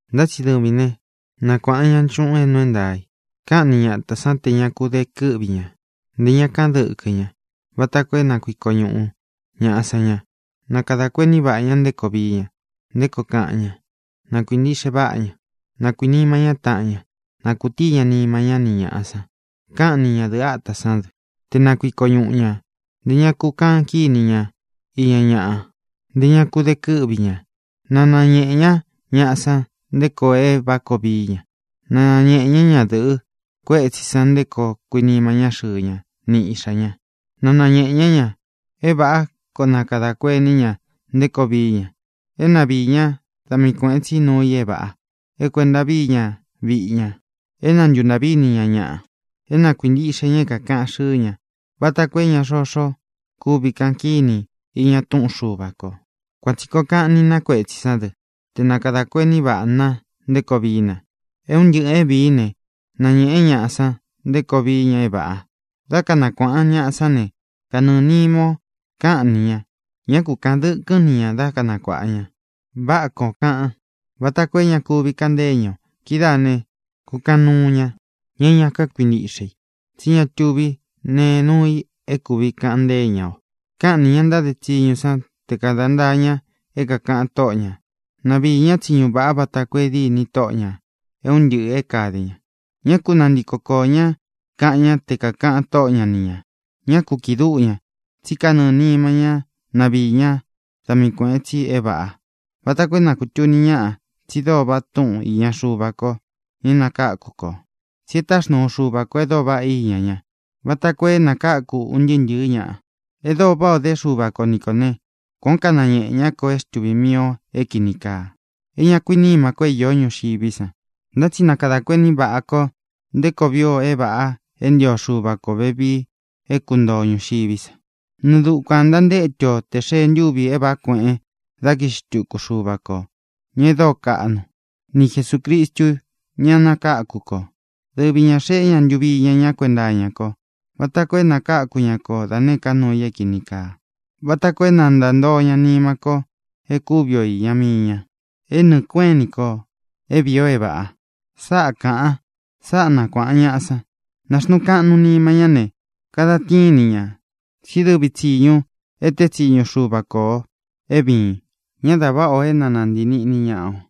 Ntá tsi dɨvīn né, nakuāꞌan ñaꞌa nchúꞌūn é nuu é ntaā i. Káꞌan ni ñatā sán tē ña ku de kɨ́ꞌvi ñā; ntē ña káꞌan dɨkɨ́ ña, vata koo é na kuiko ñuꞌu ñāꞌa san ña. Na kadā kuení vaꞌā ña nté koo vií ña, nté koo kaꞌan ña. Na kuīntiꞌxe váꞌa ña. Na kuīnima ñá taꞌan ña. Na kūtíi ña nima ñá ni ñāꞌa san. Káꞌan ni ñadɨ̄ꞌɨ átā sán dɨ te na kuiko ñuꞌu ñā; ntē ña ku kaꞌan kíni ña iña ñaꞌa; ntē ña ku de kɨ́ꞌvi ñā. Na nañēꞌe ñá ñaꞌa san nté koo é vāꞌá koo vií ña. Na nañēꞌe ñá ñadɨ̄ꞌɨ kuétsī san nté koo kuinima ñá xɨɨ ña ni iꞌxā ña. Na nañēꞌe ñá ña é vāꞌá koo na kadā kuení ña nté koo vií ña, é na viī ñá da mii kuēꞌen tsí nuu i é vāꞌa, é kuēnta vií ña viꞌi ña, é na ntuntāꞌví ini ña ñaꞌa, é na kuīntiꞌxe ña é kākaꞌan xɨ́ɨ ña, vata koo é xoxo kuvi káꞌan kíni i iña túꞌun Xuva kō. Kuan tsī koo kaꞌan ni na kuétsī sán dɨ te na kadā kuení vaꞌā na nté koo vií na. É un ntɨꞌɨ̄ é vīín ne, nañēꞌen ñáꞌa san nté koo vií ña é vāꞌa. Dá kanakuāꞌan ñaꞌa sán ne, kanɨɨ̄ nima ó kaꞌan ni ña; ñá ku kāꞌan dɨkɨ́n ni ñā dá kanakuāꞌan ña. Váꞌā koó kaꞌan, váta koo é ña kuvi kaꞌan ntée ñaꞌa o. Kidáā ne, kukaꞌan nuu ña, ña é ña kákuintiꞌxe i, tsí ña tuví nee núu i é kūvi kaꞌan ntée ña o. Káꞌan nī ña ntáde tsiñu san te kāda ntáa ña é kākaꞌan tóꞌo ñā; na viī ñá tsiñu vāꞌa vata koo é dîni tóꞌo ñā é un ntɨꞌɨ̄ é kāde ña. Ñá ku nantiko koō ñá kaꞌan ñá te kākaꞌan tóꞌo ña ni ñā. Ñá ku kīꞌi dúꞌu ña, tsí kanɨɨ̄ nima ñá na viī ñá da mii kuēꞌen tsi é vāꞌa, vata koo é na kūtuni ñáꞌa tsi dóo vaꞌa túꞌun īña Xuva ko, ña é nakáku kō. Tsi e táxnuu Xuva kō e dóo vaꞌá iña ñá, vata koo é nakáku un ntɨɨ́ ntɨ̄ɨ́ ñaꞌa. E dóo váꞌā o dé Xuva ko ni kō né, kuān ó kanañeꞌē ñá kō é xtuvī mii o é kīni kaa, é ña kuínima ko é īó ñuxiví san. Ntá tsi na kadā kuení vaꞌā ko nté koo vii o é vāꞌa é ntio Xuva kō vevii é kuntoo o ñūxiví sa. Nɨɨ dukuān ntantétu o tē xee ntúvī é vāꞌá kueꞌen da kiꞌxi xtúku Xuva kō, ña e dóo kaꞌnu, ni Jesūcristu, ña é nakáku kō. Dɨvi ñā xeꞌé ña ntuvi iña ñá kuenta iña ko vata koo é nakakū ñá ko da nēé ka nuu i é kīni kaa, vata koo é na ntāntoo ña nima ko é kuvi o īña mii ña, é nɨɨ̄ kueꞌén ini kō é vīi o é vāꞌa. Sáꞌa kāꞌan. Sáꞌa nakuāꞌan ñaꞌa san. Nāxnuun kaꞌnun nima ñá ne, kadan tíin ni ñā, tsí dɨvi tsīñu e teé tsiñu Xuva ko ō é vīin. Ñá dā váꞌa o é na nāntii niꞌni ña o.